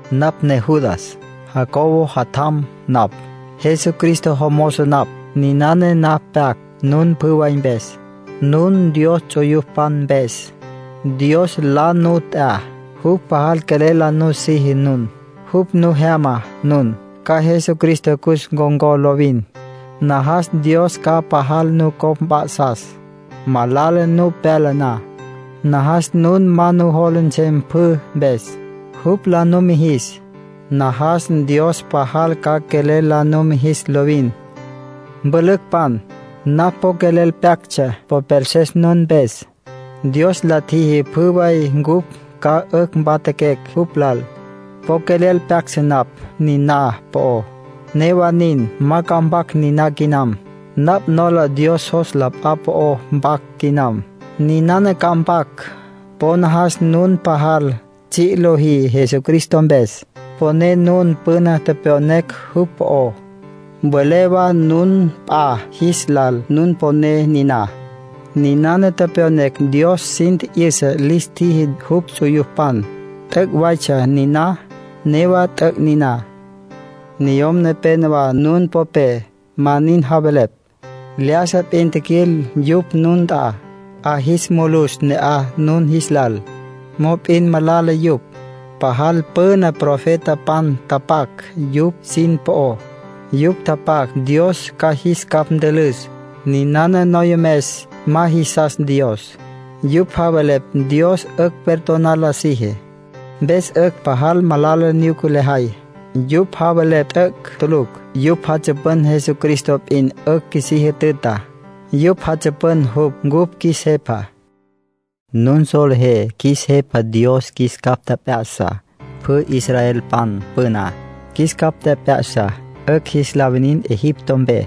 Napj ne Judas, Jacobo jatjam napj. Jesucristo jomozo napj. Ninana napj pyac nun pjü way mpes, nun Dios ts'uyupan mpes. Dios la nu t'ya. Jupj pajal quelel la nusiji nun. Jupj nu jyama nun, ca Jesucristo cus ncon̈có lovin. Najas Dios ca pajal nucopj mp'a'sas, malala nu pyala na. Najas nun ma nujola nsem pjü mpes, jupj la numijis. Najas Dios pajal ca quelel la numijis lovin. Mpülücpan, napj po quelel pyactsja popelses nun mpes. Dios la tjiji pjü way cupj ca 'ücj mpatjaquecj jupj lal. Po quelel pyactsja napj niná po'ó. Newa nin, ma ca mpac niná quinam. Napj nola Dios jos p'a po'o pyac quinam. Ninana ca mpac: po najas nun pajal tsji' lojí Jesucristo mpes. Mponé nun püna tepyonecj jupj po'ó. Mvelé wa nun p'a jis lal nun poné niná. Ninana tepyonecj Dios sin tji'yüsa lis tjiji jupj ts'uyupan. T'üc' waytsja niná. Newa t'üc' niná. Niyom nepénowa nun popé ma nin javelepj. Lyájasa p'in tjiquil yupj nun nt'a, 'a jis mulus ne'aj nun jis lal. Mop'in malala yupj. Pajal püna profetapan tapac yupj sin po'ó. Yupj tapac Dios ca jis capj ntülüs malala lajay mpes. Ninana noyomes ma jisas Dios. Yupj javelepj Dios 'ücj perdonar la siji, mpes 'ücj pajal malala nyuca lajay. Yupj javelepj t'üc' tulucj. Yupj jatsüpün Jesucristo p'in 'ücj qjuisí jütüta. Yupj jatsüpün jupj cupj qjuis Jepa. Nun solejé qjuis Jepa Dios jis capj tjep'ya'sa pjü israelpan püná. Jis capj tjep'ya'sa 'ücj jis la winin Egipto mpe,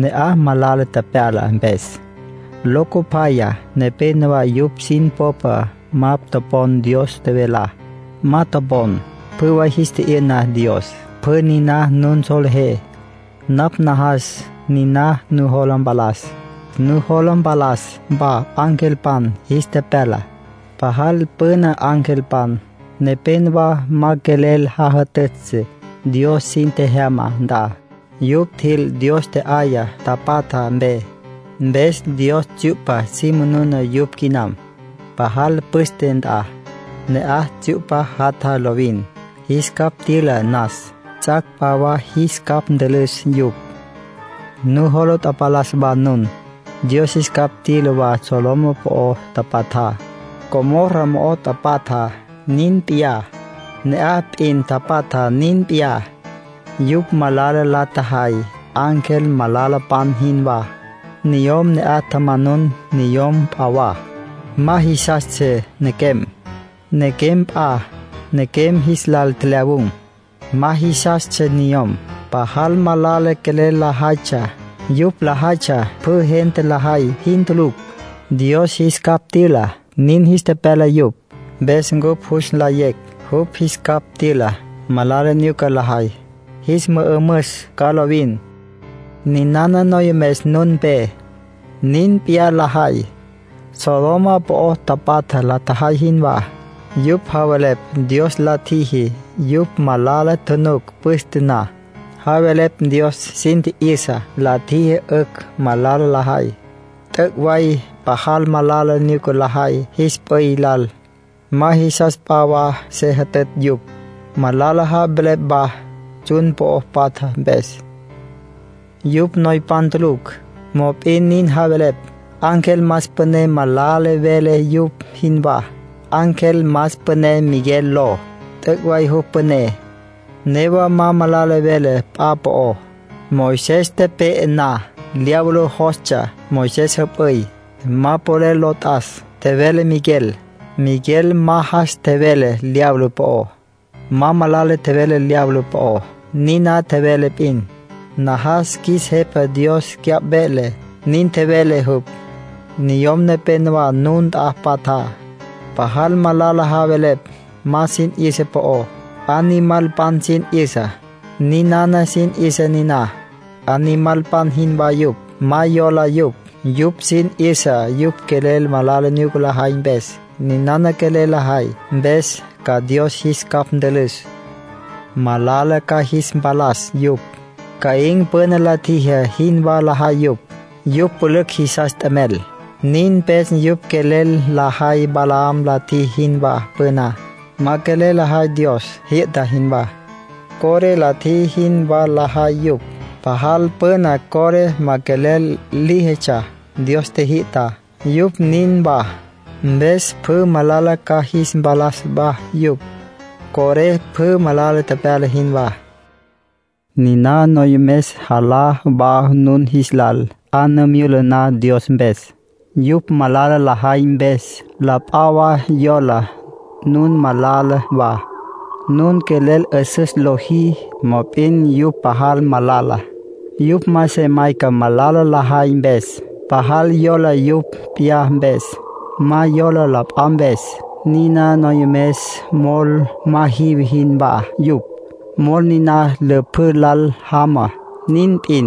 ne'aj malala tepyala mpes. Locopyaya nepénowa yupj sin popé ma topon Dios tjevelá. Ma topon, pjü way jis tji'yü'na Dios. Pjü niná nun solejé. Napj najas niná nujola mpalas. Nujola tapalas wa angelpan jis tepyala. Pajal püna angelpan nepénowa ma quelel jajütütsja Dios sin tjejyama nt'a. Yupj tjil Dios tje'yaya tapatja mpe. Mpes Dios tsyu'pa si manuna yupj quinam, pajal püste nt'a. Ne'aj tsyu'pa jatja lovin, jis capj tyüla nas. Ts'ac' p'a wa jis capj ntülüs yupj. Nujola tapalas wa nun, Dios jis capj tyüla wa Sodoma po'o tapatja, Gomorra mo'o tapatja nin p'iyá, ne'aj p'in tapatja nin p'iyá. Yupj malala la tjajay ángel malalapan jinwá. Niyom ne'aj tjamanun niyom p'a wa. Ma jisastsja nequem. Nequem p'a nequem jis lal tjelyawun̈. Ma jisastsja niyom. Pajal malala quelel lajaytsja. Yupj lajaytsja pjü gente lajay jin tulucj. Dios jis capj tyüla. Nin jis tepyala yupj, mpes cupj jus nlayecj jupj jis capj tyüla malala nyuca lajay. Jis mü'ümüs ca lovin. Ninana noyomes nun mpe, nin p'iyá lajay, Sodoma po'o tapatja la tjajay jinwá. Yupj javelepj Dios la tjiji yupj malala tjunuc püste na. Javelepj Dios sin tji'yüsa la tjiji 'ücj malala lajay. T'üc' way pajal malala nyuca lajay jis p'üy lal. Ma jisas p'a wa se jütütj yupj. Malala javelepj wa tsjun po'o patja mpes. Yupj noypan tulucj, mop'in nin javelepj. Ángel más püné ma malala vele yupj jinwá. Ángel más püné Miguel ló. T'üc' way jupj püné, newa ma malala vele p'a po'ó. Moisés tepe'e na, diablo jostsja Moisés jüp'üy. “Ma polel lo t'as”, tjevele Miguel. Miguel ma jas tjevele diablo po'ó. Ma malala tjevele diablo po'ó. Niná tjevele p'in: “Najas qjuis Jepa Dios cyapj velele”, nin tjevele jupj. Niyom nepénowa nun nt'a patja, pajal malala javelepj ma sin 'yüsa po'ó. Animalpan sin 'yüsa, ninana sin 'yüsa niná. Animalpan jinwá yupj, ma yola yupj. Yupj sin 'yüsa yupj quelel malala nyuca lajay mpes. Ninana quelel lajay mpes ca Dios jis capj ntülüs. Malala ca jis mpalas yupj. Caín püna la tjiji jinwá lajay yupj. Yupj pülücj jisas t'emel. Nin mpes yupj quelel lajay Balaam la tjiji jinwá püná. Ma quelel lajay Dios jyü'ta jinwá. Coré la tjiji jinwá lajay yupj. Pajal püna Coré ma quelel líjitsja Dios tjijyü'tá; yupj nin wa. Mpes pjü malala ca jis mpalas wa yupj, Coré pjü malala tepyala jinwá. Niná noyomes jalá wa nun jis lal, 'a nu myula na Dios mpes. Yupj malala lajay mpes, la p'a wa yola nun malala wa. Nun quelel 'üsüs lojí; mop'in yupj pajal malala. Yupj ma se mayca malala lajay mpes. Pajal yola yupj p'iyá mpes. Ma yola la p'a mpes. Niná noyomes mol ma jive jinwá yupj. Mol niná lüpjǘ lal jama, nin p'in.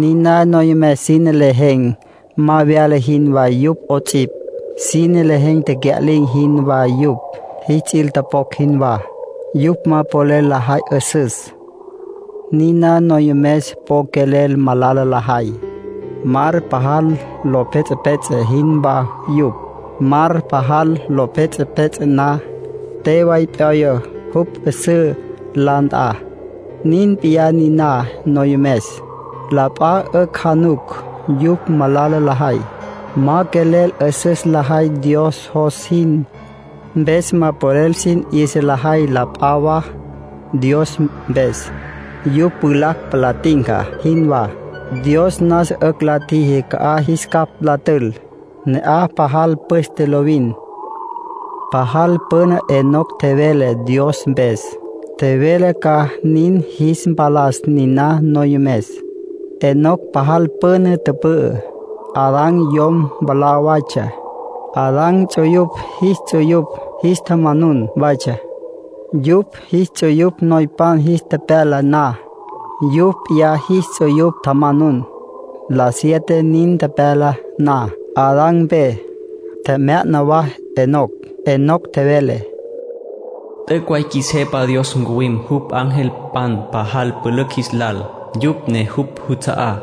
Niná noyomes sine lejen̈ ma vyala jinwá yupj 'ots'ipj. Sine lejen̈ tecya'lin̈ jinwá yupj, jis ts'il topocj jinwá. Yupj ma polel lajay 'üsüs. Niná noyomes po quelel malala lajay. Mar pajal lo pjets'epjets'e jinwá yupj. Mar pajal lo pjets'epjets'e na, te way p'yoya jupj 'üsǘ la nt'a. Nin p'iyá niná noyomes. La p'a 'ücj januc yupj malala lajay. Ma quelel 'üsüs lajay Dios jos jin, mpes ma polel sin 'yüsa lajay la p'a wa Dios mpes. Yupj pjulacj palá tinca jinwá. Dios nasa 'ücj la tjiji ca'aj jis capj la tül. Ne'aj pajal püste lovin. Pajal püna Enoc tjevele Dios mpes. Tjevele ca nin jis mpalas niná noyomes. Enoc pajal püna tüpü'ü. Adán yom mwalá waytsja. Adán ts'uyupj jis ts'uyupj jis tjamanun watsja. Yupj jis ts'uyupj noypan jis tepyala na, yupj p'iyá jis ts'uyupj tjamanun. La siete nin tepyala na Adán mpe, tjemya'na wa Enoc. Enoc tjevele: “T'üc' way qjuis Jepa Dios ncuwim jupj angelpan pajal pülücj jis lal, yupj ne jupj juts'a'á.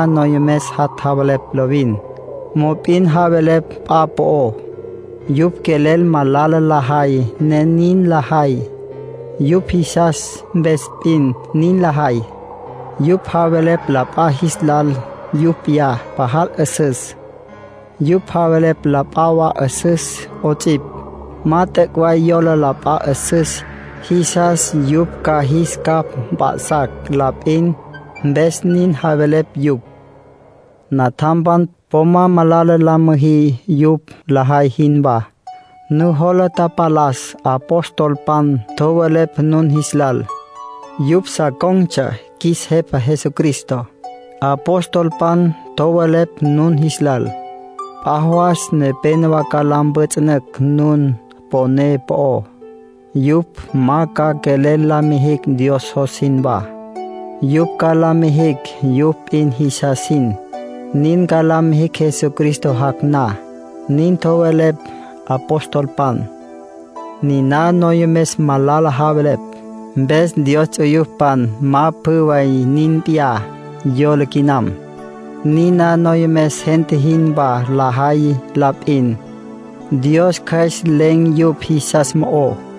Niná noyomes jat' javelepj lovin. Mop'in javelepj p'a po'ó. Yupj quelel malala lajay, ne nin lajay. Yupj jisas mpes p'in nin lajay. Yupj javelepj la p'a jis lal yupj p'iyá pajal 'üsüs. Yupj javelepj la p'a wa 'üsüs 'ots'ipj; ma t'üc' way yola la p'a 'üsüs, jisas yupj ca jis capj mp'a'sacj la p'in, mpes nin javelepj yupj. Natjampan, po ma malala la müjí yupj lajay jinwá. Nujola tapalas apostolpan tjowelepj nun jis lal. Yupj sa con̈tsja qjuis Jepa Jesucristo. Apostolpan tjowelepj nun jis lal: “P'a jawas nepénowa ca la mpjüts'ünücj nun poné po'ó. Yupj ma ca quelel la mijicj Dios jos jinwá. Yupj ca la mijicj yupj p'in jisas jin. Nin ca la mijicj Jesucristo jac' na”, nin tjowelepj apostolpan. Niná noyomes malala javelepj, mpes Dios ts'uyupan ma pjü nin p'iyá yola quinam. Niná noyomes gente jinwá lajay la p'in. Dios Cjües len̈ yupj jisas mo'ó.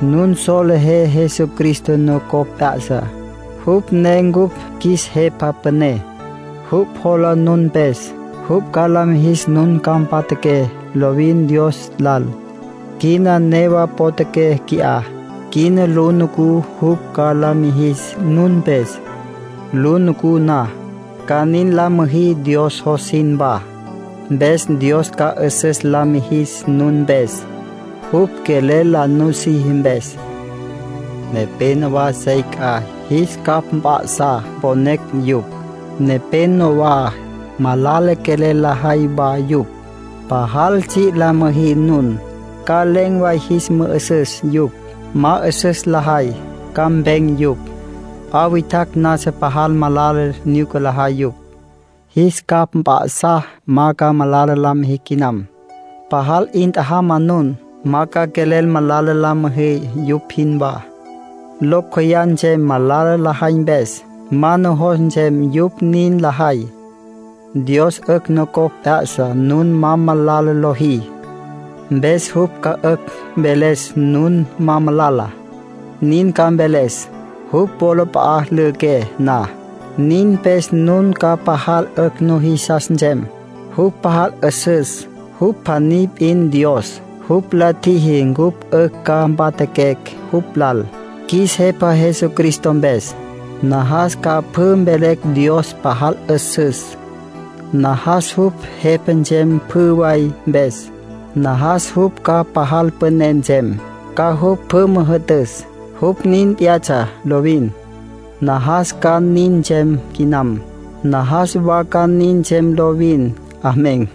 Nun solejé Jesucristo nucopj p'ya'sa, jupj ne cupj qjuis Jepa Püné. Jupj jola nun mpes. Jupj ca la mijis nun ca mpatjaqué lovin Dios lal. Quina newa potjaqué qui'á. Quina lu nucú jupj ca nin la mijis nun mpes. Lu nucú na, ca nin la müjí Dios jos jinwá. Mpes Dios ca 'üsüs la mijis nun mpes, jupj quelel la nusiji mpes. Nepénowa sey c'a; jis capj mp'a'sá mponecj yupj. Nepénowa malala quelel lajay wa yupj. Pajal tsji' la müjí nun, ca len̈ way jis mü'ü'süs yupj. Ma 'üsüs lajay, ca mpen̈ yupj. P'a witjacj nasa pajal malala nyuca lajay yupj. Jis capj mp'a'sá ma ca malala la mijicj quinam. Pajal 'in tjajama nun, ma ca quelel malala la müjí yupj jinwá. Locj meyá nsem malala lajay mpes. Ma ca nujos nsem yupj nin lajay. Dios 'ücj nucopj p'ya'sa nun ma malala lojí. Mpes jupj ca 'ücj mveles nun ma malala. Nin ca mveles, jupj wolap'a'a lüjüqué na. Nin mpes nun ca pajal 'ücj nujisas nsem. Jupj pajal 'üsüs. Jupj pjaní p'in Dios. Jupj la tjiji cupj 'ücj ca mpatjaquecj jupj lal, qjuis Jepa Jesucristo mpes. Najas ca pjü mvelecj Dios pajal 'üsüs. Najas jupj Jepa nsem pjü way mpes. Najas jupj ca pajal püné nsem, ca jupj pjü müjü'tüs. Jupj nin p'iyatsja lovin. Najas ca nin nsem quinam. Najas wa ca nin nsem lovin. Amén.